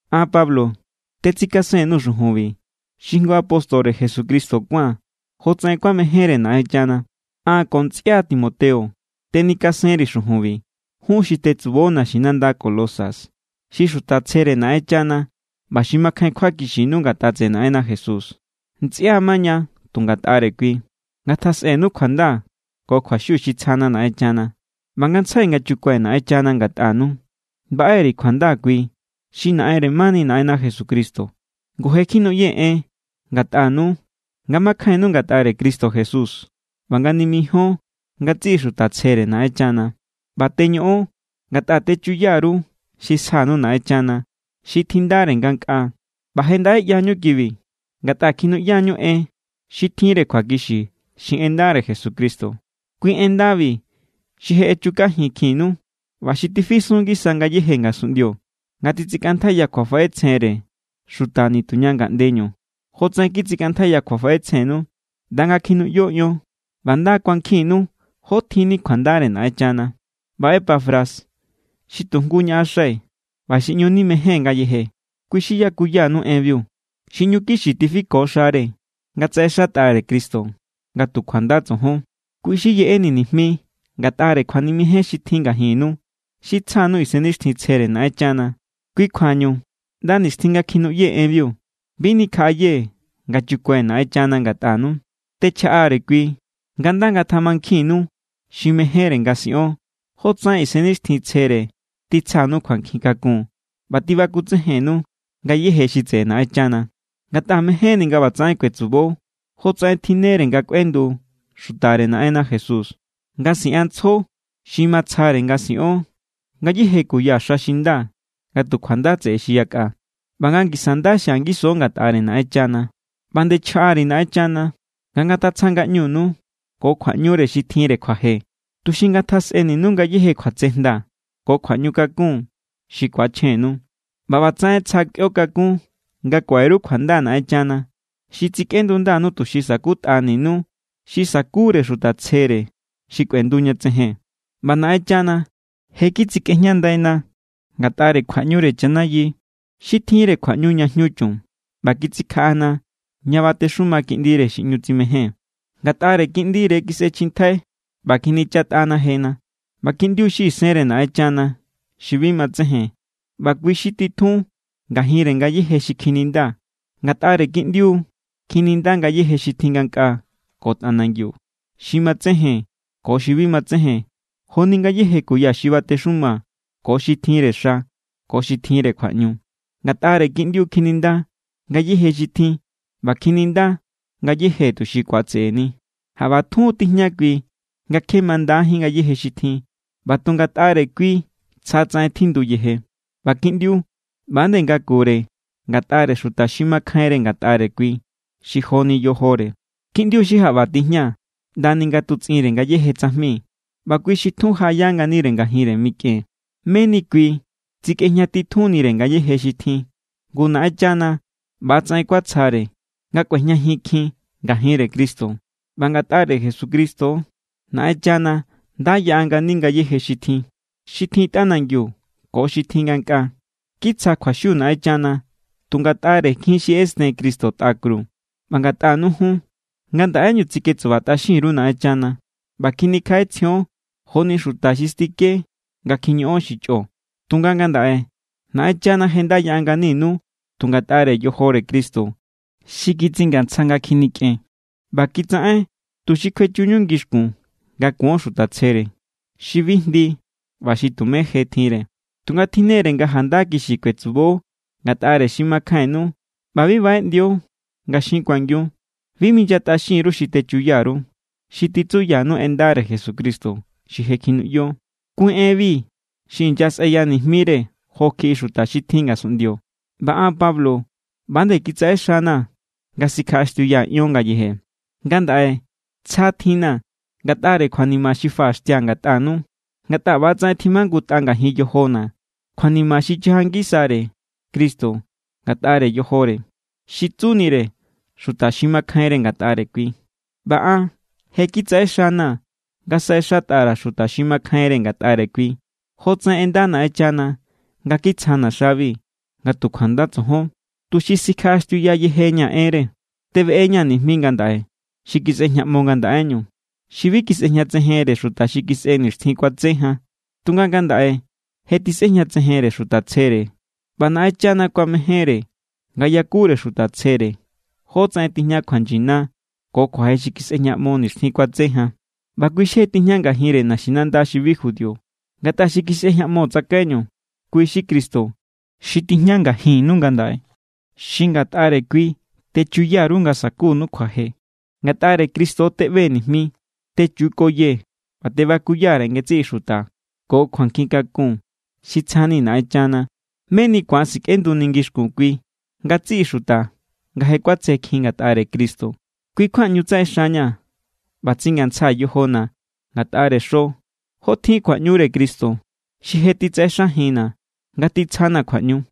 An, Pablo, tetsikasen_nuu̱ xujunbi, xi jngu apóstore Jesucristo kuáa̱n jotsaꞌen kuamejénre Naꞌenchana. An ko ntsꞌia Timoteo tenikasenri̱ xujunbi jun xi tetsubo naxinanda Colosas, xi xuta tsjere Naꞌenchana ꞌba xi makjain kjuakixinu ngatꞌa tseꞌe Naꞌenna Jesús. Ntsꞌia maña tu ngatꞌare kui. Ngatjasꞌenu kjuanda ko kjuaxiu xi tsjana Naꞌenchana. ꞌBa ngantsjai nga chukue̱ Naꞌenchana ngatꞌanu, baꞌe_ri̱ kjuanda kui xi Naꞌenre mani Naꞌenna Jesucristo. Ngu je kjinuꞌyee̱ en ngatꞌanu nga makjainnu ngatꞌare Cristo Jesús ꞌba nga nimijíon ngatsiꞌi xuta tsjere Naꞌenchana. ꞌBa teñoꞌon ngatꞌa techuya_ru xi sjanu Naꞌenchana, xi tjindare ngankꞌaa. ꞌBa je ndaꞌe ꞌyañu kibi ngatꞌa kjinuꞌyañu en xi tjinre kjuakixi, xi en ndare Jesucristo. Kui en ndabi xi je echukajinkjinnu ꞌba xi tifisun=ngisa ngayéje ngasunꞌndio nga titsikꞌantjaiya kjuafaꞌetsjenre xuta nituña ngaꞌndeñu jotsaꞌen kitsikꞌantjaiya kjuafaꞌetsjennu ꞌnda nga kjinuꞌyo ion ꞌba nda kuankjinnu jó tjinni kjuandare Naꞌenchana. ꞌBa Epafras xi tu jngu ñaꞌaxai̱ ꞌba xi ꞌñu nimejée̱n ngayeje, kui xi yakuyanu enbiu. Xi ꞌñu kixi tifiko xare nga tsaꞌexatꞌare Cristo nga tu kjuanda tsojon. Kui xi yeꞌeni̱ nijmi ngatꞌare kjuanimejen xi tjin ngajinnu, xi tsja_nuu̱ Isennixtjintsjere Naꞌenchana. Kui kjuañu, ꞌnda nixtjin nga kjinuꞌyee̱ enbiu, bi nikjaꞌayee̱ nga chukue̱ Naꞌenchana ngatꞌanu. Techjaꞌa_ri̱ kui nga nda ngatjamankjinninu xi mejénre nga siꞌon, jotsaꞌen Isennixtjintsjere titsjanu kjuankjin kakun ꞌba tibakutsejennu ngayéje xi tseꞌe Naꞌenchana. Ngatꞌa mejénni̱ nga ꞌbatsaꞌen kuetsubo jotsaꞌen tjinnere nga kꞌuendu xutare Naꞌenna Jesús, nga siꞌanntsjo xi matsjare nga siꞌon ngayéje kuya xa xi nda nga tu kjuanda tseꞌe xi yakꞌa, ꞌba nga ngisa nda xia ngiso ngatꞌare Naꞌenchana. ꞌBa nde chjaꞌa_ri̱ Naꞌenchana nga ngatatsja ngaꞌñunu ko kjuaꞌñure xi tjinre kjuaje, tuxi ngatjasꞌeninu ngayéje kjuatsejnda ko kjuaꞌñukakun xi ku̱achjennu. ꞌBa ꞌbatsaꞌen tsja kꞌuio kakún nga kuaꞌe_ru kjuanda Naꞌenchana xi tsikꞌendundanu tuxi sa̱kutꞌaninu xi sa̱kure xuta tsjere xi kꞌuendu ña tsejen. ꞌBa Naꞌenchana je kitsikꞌejñandaina ngatꞌare kjuaꞌñure chanayi xi tjinre kjuaꞌñu ña jñu chun ꞌba kitsikjaꞌana ña batexuma Kiꞌndire xi ꞌñu tsimején. Ngatꞌare Kiꞌndire kisꞌechjintjai ꞌba kjinichatꞌana jena. ꞌBa Kiꞌndiu xi isenre Naꞌenchana xi bi matsejen, ꞌba kui xi tjun ngajinre ngayéje xi kjininda. Ngatꞌare Kiꞌndiu kjininda ngayéje xi tjin ngankꞌaa ko tꞌanangiu, xi matsejen ko xi bi matsejen joni ngayéje kuya xi batexuma ko xi tjinre xa ko xi tjinre kjuaꞌñu. Ngatꞌare Kiꞌndiu kjininda ngayéje xi tjin, ꞌba kjininda ngayéje tuxi ku̱atse̱ꞌe̱ni. Jaꞌba tjun tijña kui nga kje mandajín ngayéje xi tjin, ꞌba tu ngatꞌare kui tsjatsaꞌen tjinduyeje. ꞌBa Kiꞌndiu ꞌba=nde ngakure ngatꞌare xuta xi makjainre ngatꞌare kui, xi joni yojore. Kiꞌndiu xi jaꞌba tijña ꞌndani nga tutsꞌinre ngayéje tsajmi ꞌba kui xi tjun jaꞌaya nganire ngajinre mikꞌen, meni kui tsikꞌejña titjunre ngayéje xi tjin. Ngu Naꞌenchana ꞌbatsaꞌen kuatsjare nga kꞌuejñajinkjin ngajin Cristo. ꞌBa ngatꞌare Jesucristo= Naꞌenchana nda yaꞌa ngani ngayéje xi tjin, xi tjin tꞌanangiu ko xi tjin ngankꞌaa. Kitsja kjuaxiu Naꞌenchana tu ngatꞌare jin xi ꞌesten Cristo tꞌa kru. ꞌBa ngatꞌanu jun, ngandaꞌeñu tsiketsubatꞌaxin_ru Naꞌenchana ꞌba kjinikjaꞌetsjion joni xuta xi stike nga kjiñoꞌon xi chꞌo. Tunga ngandaꞌe Naꞌenchana je nda yaꞌa nganinu tu ngatꞌare yojore Cristo xi kitsingantsja nga kjinikꞌen. ꞌBa kitsaꞌen tuxi kjuechuñu ngixkun nga kuon xuta tsjere, xi bi jndi ꞌba xi tumé je tjinre. Tunga tjinne=re nga janda kixi kuetsubo ngatꞌare xi makjainnu ꞌba bi baꞌeꞌndio nga xin kuangiu. Bi minyatꞌaxin_ru xi techuya_ru, xi titsuyanu en ndare Jesucristo xi je kjinuꞌyo. Kui enbi xi inyasꞌeyanijmire jo kjiꞌi xuta xi tjin ngasunꞌndio, ꞌba an Pablo ꞌba nde kitsaꞌe xana̱ nga sikjaꞌaxtiuyaa̱ ion ngayeje. Ngandaꞌe tsja tjinna̱ ngatꞌare kjuanima xi faꞌaxtia̱ ngatꞌanu. Ngatꞌa ꞌbatsaꞌen tjimajngutꞌa ngajin yojona̱ kjuanima xi chaja ngisare Cristo ngatꞌare yojore, xi tsunire xuta xi makjainre ngatꞌare Kui. ꞌBa an je kitsaꞌe xana̱ nga saꞌexatꞌa_ra̱ xuta xi makjainre ngatꞌare kui, jotsaꞌen ꞌenda Naꞌenchana nga kitsjana̱ xabi nga tu kjuanda tsojon, tuxi sikjaꞌaxtiuya yejeña̱ enre. Tebeꞌeña̱ nijmi ngandaꞌe xi kisꞌejñaꞌmo ngandaꞌeñu, xi bi kisꞌejñatsejenre xuta xi kisꞌe nixtjin kuatse jan. Tunga ngandaꞌe je tisꞌejñatsejenre xuta tsjere. ꞌBa Naꞌenchana kuamejénre nga yakure xuta tsjere jótsaꞌen tijña kjuanyina ko kjuaje xi kisꞌejñaꞌmo nixtjin kuatse jan. ꞌBa kui xi je tijña ngajinre naxinanda xi bi judío. Ngatꞌa xi kisꞌejñaꞌmo tsakaiñu, kui xi Cristo xi tijña ngajinnu ngandaꞌe, xi ngatꞌare kui techuya_ru nga sa̱kunu kjuaje. Ngatꞌare Cristo teꞌbee̱ nijmi. Techukoyee̱ ꞌba tebakuya_ri̱ ngatsiꞌi xuta ko kjuankjin kakun xi tsjani̱ Naꞌenchana, meni ku̱an sikꞌenduni̱ ngixkun kui ngatsiꞌi xuta nga je kuatsjekjin ngatꞌare Cristo. Kui= kjua ꞌñu tsaꞌexaña̱ ꞌba tsingantsjaa̱ yojona̱ ngatꞌare xo, jotjin kjuaꞌñure Cristo xi je xi titsaꞌexajinna̱ nga titsjana̱ kjuaꞌñu.